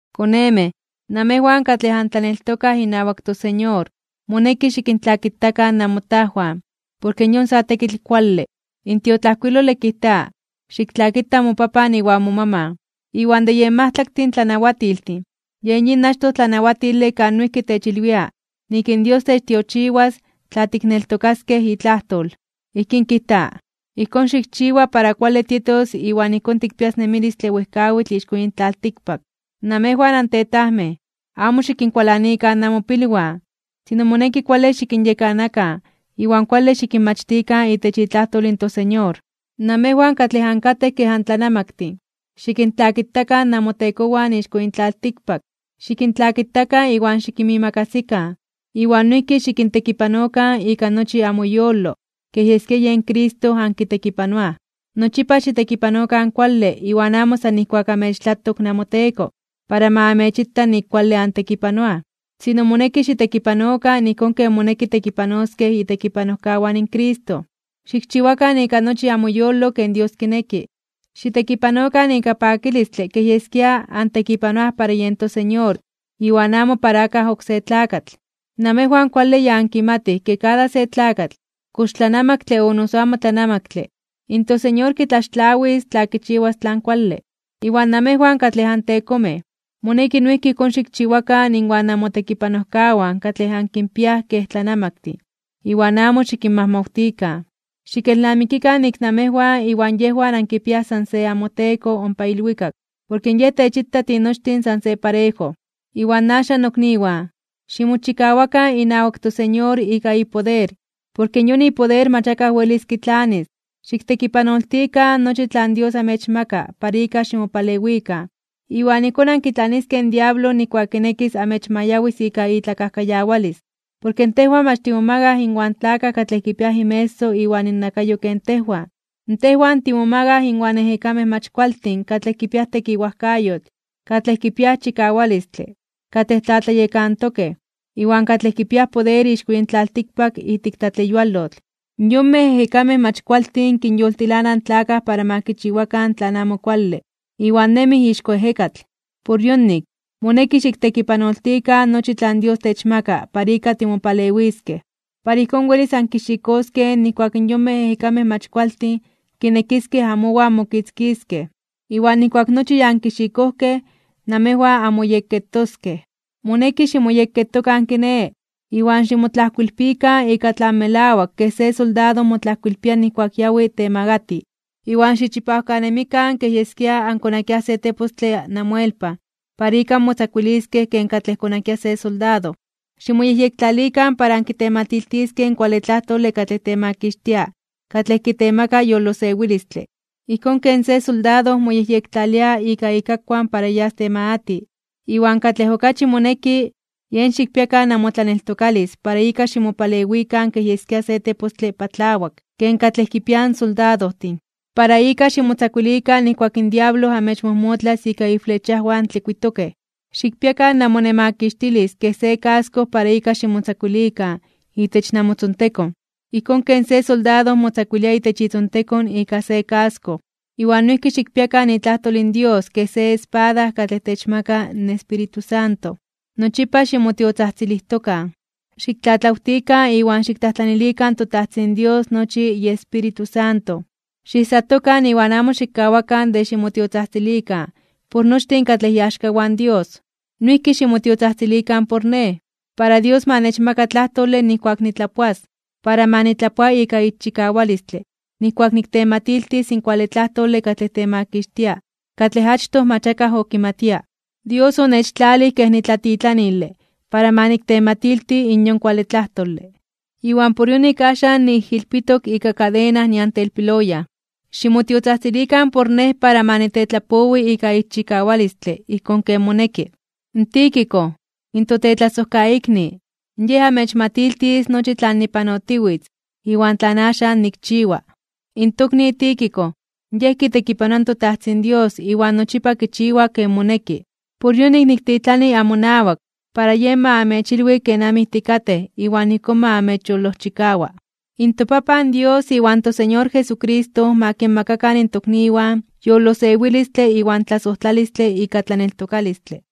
Konemej, namejwan katlej antlaneltokaj inawak toSeñor, moneki xikintlakitakan namotajwan, porke yon sa tekitl kuale. In tiotlajkuilole kijta: “Xiktlakita mopapan iwan momaman.” Iwan de yen majtlaktin tlanawatiltin, yen yin achtoj tlanawatile kan noijki techilwia nik in Dios techtiochiwas tla tikneltokaskej itlajtol. Ijkín kijta: “Ijkón xikchiwa para kuale tietos iwan ijkón tikpias nemilistle wejkawitl ixko yin tlaltikpak.” Namejwan antetajmej, amo xikinkualanikan namopilwan, sino moneki kuale xikinyekanakan iwan kuale xikinmachtikan itech itlajtol in toSeñor. Namejwan katlej ankatej kej antlanamaktin, xikintlakitakan namotekowan ixko yin tlaltikpak. Xikintlakitakan iwan xikinmiimakasikan, iwan noijki xikintekipanokan ika nochi amoyolo kej yeskia yen Cristo ankitekipanoaj. Nochipa xitekipanokan kuale iwan amo san nijkuak amechtlatok namoteko, para ma amechita nik kuale antekipanoaj. Sino moneki xitekipanokan ijkón ken moneki tekipanoskej itekipanojkawan in Cristo. Xikchiwakan ika nochi amoyolo ken Dios kineki. Xitekipanokan ika pakilistle kej yeskia antekipanoaj para yen toSeñor iwan amo para akaj oksé tlakatl. Namejwan kuale ya ankimatij ke kada se tlakatl, kox tlanamaktle o noso amo tlanamaktle, in toSeñor kitlaxtlawis tla kichiwas tlan kuale. Iwan namejwan katlej antekomej, moneki noijki ijkón xikchiwakan inwan namotekipanojkawan katlej ankinpiaj kej tlanamaktin, iwan amo xikinmajmawtikan. Xikelnamikikan nik namejwan iwan yejwan ankipiaj san se amoTeko ompa ilwikak, porke Yej techita tinochtin san se parejo. Iwan axan, nokniwan, ximochikawakan inawak toSeñor ika ipoder, porke yon ipoder mach akaj welis kitlanis. Xiktekipanoltikan nochi tlan Dios amechmaka para ika ximopalewikan, iwan ijkón ankitlaniskej in diablo nijkuak kinekis amechmayawis ika itlakajkayawalis. Porke tejwan mach timomagaj inwan tlakaj katlej kipiaj inmeso iwan innakayo ken tejwan. Tejwan timomagaj (tikmomakaj) inwan ejekamej mach kualtin katlej kipiaj tekiwajkayotl, katlej kipiaj chikawalistle, katlej tlatlayekantokej, iwan katlej kipiaj poder ixko yin tlaltikpak ijtik tlatleyualotl. Yonmej ejekamej mach kualtin kinyoltilanaj in tlakaj para ma kichiwakan tlan amo kuale, iwan nemij ixko ejekatl. Por yonik, moneki xiktekipanoltikan nochi tlan Dios techmaka para ika timopalewiskej, para ijkón welis ankixikoskej nijkuak in yonmej ejekamej mach kualtin kinekiskej amowan mokitzkiskej. Iwan nijkuak nochi ya ankixikojkej, namejwan anmoyekketoskej. Moneki ximoyekketokan kiné, iwan ximotlajkoilpikan ika tlan melawak ken se soldado motlajkoilpia nijkuak yawi temagati (temakatij). Iwan xichipawkanemikan kej yeskia ankonakiaj se tepostle namoelpan para ika anmotzakuiliskej ken katlej konakia se soldado. Ximoyejyektlalikan para ankitematiltiskej in kuale tlajtole katlej temakixtia katlej kitemaka yolosewilistle, ijkón ken se soldado moyejyektlalia ika ikakuan para yas temagati (temakatij). Iwan katlej okachi moneki, yen xikpiakan namotlaneltokalis para ika ximopalewikan kej yeskia se tepostle patlawak, ken katlej kipiaj in soldadojtin, para ika ximotzakuilikan nijkuak in diablo amechmojmotlas ika iflechajwan tlikuitokej. Xikpiakan namonemakixtilis kej se kasko para ika ximotzakuilikan itech namotzontekon, ijkón ken se soldado motzakuilia itech itzontekon ika se kasko. Iwan noijki xikpiakan itlajtol in Dios kej se espada katlej techmaka in Espíritu Santo. Nochipa ximotiotzajtzilijtokan. Xiktlatlawtikan iwan xiktlajtlanilikan in toTajtzin Dios nochi iEspíritu Santo. Xiijsatokan iwan amo xikkawakan de ximotiotzajtzilikan por nochtin katlej iaxkawan in Dios. Noijki ximotiotzajtzilikan por nej, para Dios ma nechmaka tlajtole nijkuak nitlapoas, para ma nitlapoa ika ixchikawalistle nijkuak niktematiltis in kuale tlajtole katlej temakixtia katlej achtoj mach akaj okimatia. Dios onechtlalij kej nitlatitlanile para ma niktematilti in yon kuale tlajtole. Iwan por yonik axan niijilpitok ika kadena nian telpiloyan. Ximotiotzajtzilikan por nej para ma nitetlapowi ika ixchikawalistle ijkón ken moneki. Tíquico, in totetlasojkaikni, yej amechmatiltis nochi tlan nipanotiwitz iwan tlan axan nikchiwa. In tokni Tíquico yej kitekipanoa in toTajtzin Dios iwan nochipa kichiwa ken moneki. Por yonik niktitlani amonawak, para yej ma amechilwi kenamij tikatej iwan ijkón ma amechyolojchikawa. ToPapan Dios iwan toSeñor Jesucristo ma kinmakakan in tokniwan yolosewilistle iwan tlasojtlalistle ika tlaneltokalistle.